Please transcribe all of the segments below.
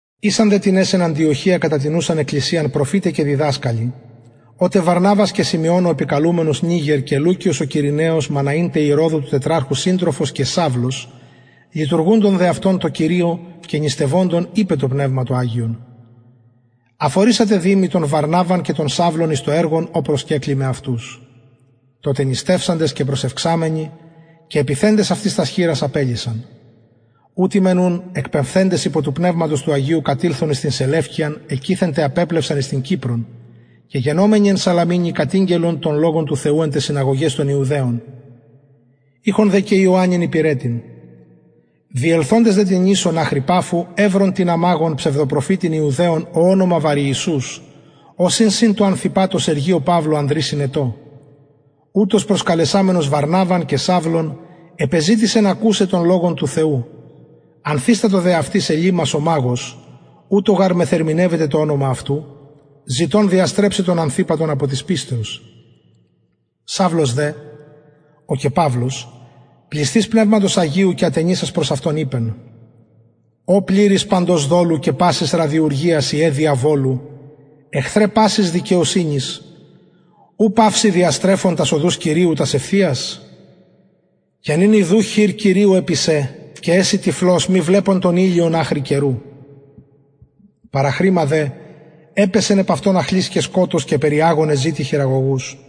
ησαν δε τινες εν αντιοχεια κατα την ουσαν εκκλησιαν προφηται και διδασκαλοι ο τε βαρναβας και συμεων ο καλουμενος νιγερ και λουκιος ο κυρηναιος μαναην τε ηρωδου του τετραρχου συντροφος και σαυλος λειτουργουντων δε αυτων τω κυριω και νηστευοντων ειπεν το πνευμα το αγιον αφορισατε δη μοι τον βαρναβαν και τον σαυλον εις το εργον ο προσκεκλημαι αυτους τοτε νηστευσαντες και προσευξαμενοι και επιθεντες τας χειρας αυτοις απελυσαν ουτοι μεν ουν εκπεμφθεντες υπο του πνευματος του αγιου κατηλθον εις την σελευκειαν εκειθεν δε απεπλευσαν εις την κυπρον και γενομενοι εν σαλαμινι κατηγγελλον τον λογον του θεου εν ταις συναγωγαις των ιουδαιων ειχον δε και ιωαννην υπηρετην διελθοντες δε την νησον αχρι παφου ευρον τινα μαγον ψευδοπροφητην ιουδαιον ω ονομα βαριησους ος ην συν τω ανθυπατω σεργιω παυλω ανδρι συνετω ουτος προσκαλεσαμενος βαρναβαν και σαυλον επεζητησεν ακουσαι τον λογον του θεου ανθιστατο δε αυτοις ελυμας ο μαγος ουτως γαρ μεθερμηνευεται το ονομα αυτου ζητων διαστρεψαι τον ανθυπατον απο της πιστεως σαυλος δε ο και παυλος πλησθεις πνευματος αγιου και ατενισας εις αυτον ειπεν ω πληρης παντος δολου και πασης ραδιουργιας υιε διαβολου εχθρε πασης δικαιοσυνης ου παυση διαστρεφων τας οδους κυριου τας ευθειας και νυν ιδου χειρ κυριου επι σε και εση τυφλος μη βλεπων τον ηλιον αχρι καιρου παραχρημα δε επεπεσεν επ αυτον αχλυς και σκοτος και περιαγων εζητει χειραγωγους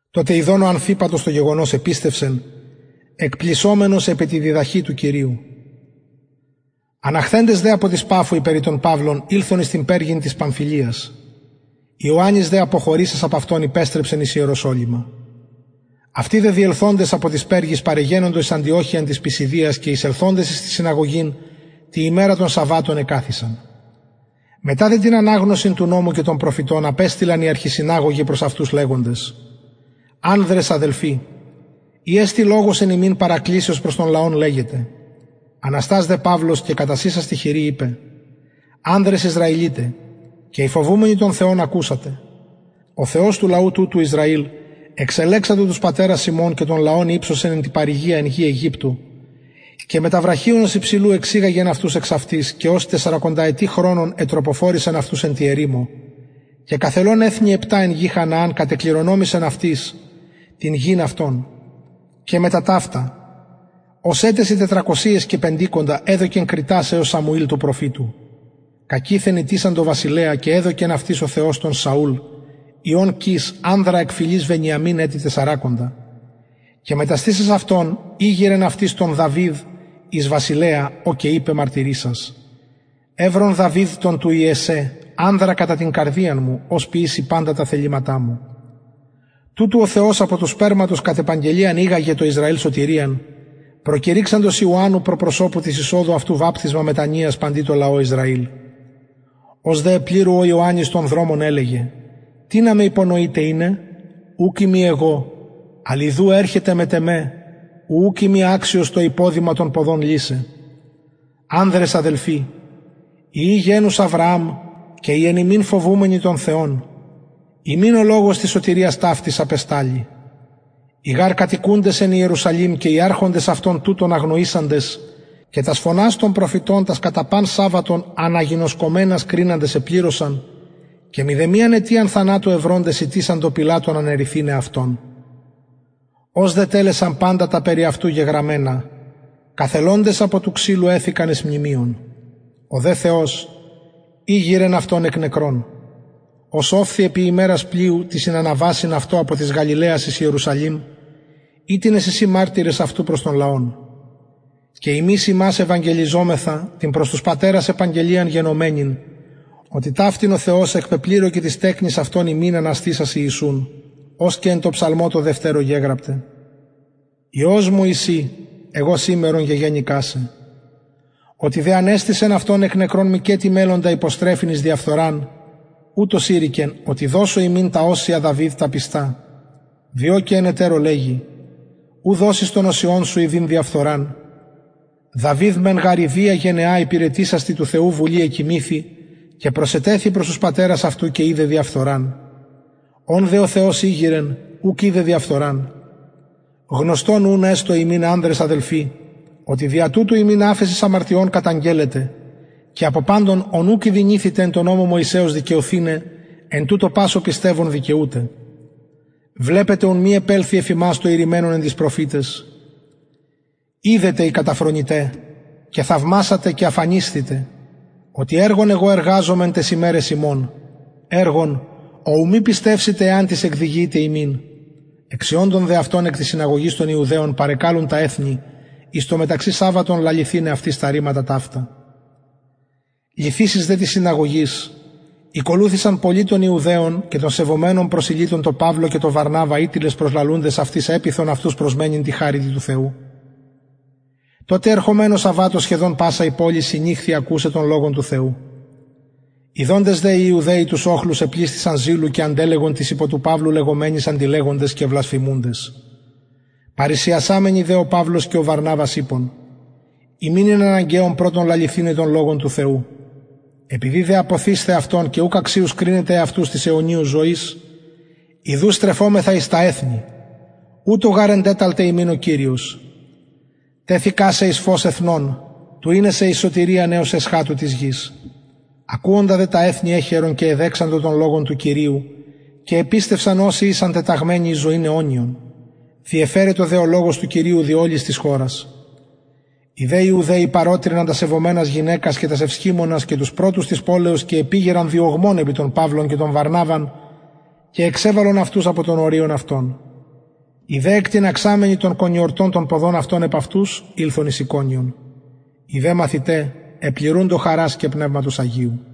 τοτε ιδων ο ανθυπατος το γεγονος επιστευσεν εκπλησσομενος επι τη διδαχη του κυριου αναχθεντες δε απο της παφου οι περι τον παυλον ηλθον εις περγην της παμφυλιας ιωαννης δε αποχωρησας απ αυτων υπεστρεψεν εις ιεροσολυμα αυτοι δε διελθοντες απο της περγης παρεγενοντο εις αντιοχειαν της πισιδιας και εισελθοντες εις την συναγωγην τη ημερα των σαββατων εκαθισαν μετα δε την αναγνωσιν του νομου και των προφητων απεστειλαν οι αρχισυναγωγοι προς αυτους λεγοντες ανδρες αδελφοι ει εστιν λογος εν υμιν παρακλησεως προς τον λαον λεγετε αναστας δε παυλος και κατασεισας τη χειρι ειπεν ανδρες ισραηλιται και οι φοβουμενοι τον θεον ακουσατε ο θεος του λαου τουτου εξελεξατο τους πατερας ημων και τον λαον υψωσεν εν τη παροικια εν γη αιγυπτω και μετα βραχιονος υψηλου εξηγαγεν αυτους εξ αυτης και ως τεσσαρακονταετη χρονον ετροποφορησεν αυτους εν τη ερημω και καθελων εθνη επτα εν γη χανααν κατεκληρονομησεν αυτοις την γην αυτων και μετα ταυτα ως ετεσιν τετρακοσιοις και πεντηκοντα εδωκεν κριτας εως σαμουηλ του προφητου κακειθεν ητησαντο βασιλεα και εδωκεν αυτοις ο θεος τον σαουλ υιον κις ανδρα εκ φυλης βενιαμιν ετη τεσσαρακοντα και μεταστησας αυτον ηγειρεν αυτοις τον δαυιδ εις βασιλεα ω και ειπεν μαρτυρησας ευρον δαυιδ τον του ιεσσαι ανδρα κατα την καρδιαν μου ος ποιησει παντα τα θεληματα μου τουτου ο θεος απο του σπερματος κατ επαγγελιαν ηγαγεν τω ισραηλ σωτηριαν προκηρυξαντος ιωαννου προ προσωπου της εισοδου αυτου βαπτισμα μετανοιας τω ισραηλ ως δε επληρου ο ιωαννης τον δρομον ελεγεν τινα με υπονοειτε ειναι ουκ ειμι εγω αλλ ιδου ερχεται μετ εμε ου ουκ ειμι αξιος το υποδημα των ποδων λυσαι ανδρες αδελφοι υιοι γενους αβρααμ και οι εν υμιν φοβουμενοι τον θεον υμιν ο λογος της σωτηριας ταυτης απεσταλη οι γαρ κατοικουντες εν ιερουσαλημ και οι αρχοντες αυτων τουτον αγνοησαντες και τας φωνας των προφητων τας κατα παν σαββατον αναγινωσκομενας κριναντες επληρωσαν και μηδεμιαν αιτιαν θανατου ευροντες ητησαντο πιλατον αναιρεθηναι αυτον ως δε ετελεσαν παντα τα περι αυτου γεγραμμενα καθελοντες απο του ξυλου εθηκαν εις μνημειον ο δε θεος ηγειρεν αυτον εκ νεκρων ος ωφθη επι ημερας πλειους τοις συναναβασιν αυτω απο της γαλιλαιας εις ιερουσαλημ οιτινες εισιν μαρτυρες αυτου προς τον λαον και ημεις υμας ευαγγελιζομεθα την προς τους πατερας επαγγελιαν γενομενην οτι ταυτην ο θεος εκπεπληρωκεν τοις τεκνοις αυτων ημιν αναστησας ιησουν ως και εν τω ψαλμω τω δευτερω γεγραπται υιος μου ει συ εγω σημερον γεγεννηκα σε οτι δε ανεστησεν αυτον εκ νεκρων μηκετι μελλοντα υποστρεφειν εις διαφθοραν ουτως ειρηκεν οτι δωσω υμιν τα οσια δαυιδ τα πιστα διο και εν ετερω λεγει ου δωσεις τον οσιον σου ιδειν διαφθοραν δαυιδ μεν γαρ ιδια γενεα υπηρετησας τη του θεου βουλη εκοιμηθη και προσετεθη προς τους πατερας αυτου και ειδεν διαφθοραν ον δε ο θεος ηγειρεν ουκ ειδεν διαφθοραν γνωστον ουν εστω υμιν ανδρες αδελφοι οτι δια τουτου υμιν αφεσις αμαρτιων καταγγελλεται και απο παντων ων ουκ ηδυνηθητε εν τω νομω μωυσεως δικαιωθηναι εν τουτω πας ο πιστευων δικαιουται βλεπετε ουν μη επελθη εφ υμας το ειρημενον εν τοις προφηταις ιδετε οι καταφρονηται και θαυμασατε και αφανισθητε οτι εργον εγω εργαζομαι εν ταις ημεραις υμων ο ου μη πιστευσητε εαν τις εκδιηγηται υμιν εξιοντων δε εκ της συναγωγης των ιουδαιων παρεκαλουν τα εθνη εις το μεταξυ σαββατον λαληθηναι αυτοις τα ρηματα λυθεισης δε της συναγωγης ηκολουθησαν πολλοι των ιουδαιων και των σεβομενων προσηλυτων τω παυλω και τω βαρναβα οιτινες προσλαλουντες επειθον αυτους επιμενειν τη χαριτι του θεου τω τε ερχομενω σαββατω σχεδον πασα η πολις συνηχθη ακουσαι τον λογον του θεου ιδοντες δε οι ιουδαιοι τους οχλους επλησθησαν ζηλου και αντελεγον τοις υπο του παυλου λεγομενοις αντιλεγοντες και βλασφημουντες παρρησιασαμενοι δε ο παυλος και ο βαρναβας ειπον υμιν ην αναγκαιον πρωτον λαληθηναι τον λογον του θεου επειδη δε απωθεισθε αυτον και ουκ αξιους κρινετε εαυτους της αιωνιου ζωης ιδου στρεφομεθα εις τα εθνη ουτως γαρ εντεταλται ημιν ο κυριος τεθεικα σε εις φως εθνων του ειναι σε εις σωτηριαν εως εσχατου της γης ακουοντα δε τα εθνη εχαιρεν και εδοξαζον τον λογον του κυριου και επιστευσαν οσοι ησαν τεταγμενοι εις ζωην αιωνιον διεφερετο δε ο λογος του κυριου δι ολης της χωρας οι δε ιουδαιοι παρωτρυναν τας σεβομενας γυναικας και τας ευσχημονας και τους πρωτους της πολεως και επηγειραν διωγμον επι τον παυλον και τον βαρναβαν και εξεβαλον αυτους απο των οριων αυτων οι δε εκτιναξαμενοι τον κονιορτον των ποδων αυτων επ αυτους ηλθον εις ικονιον οι δε μαθηται επληρουντο χαρας και πνευματος αγιου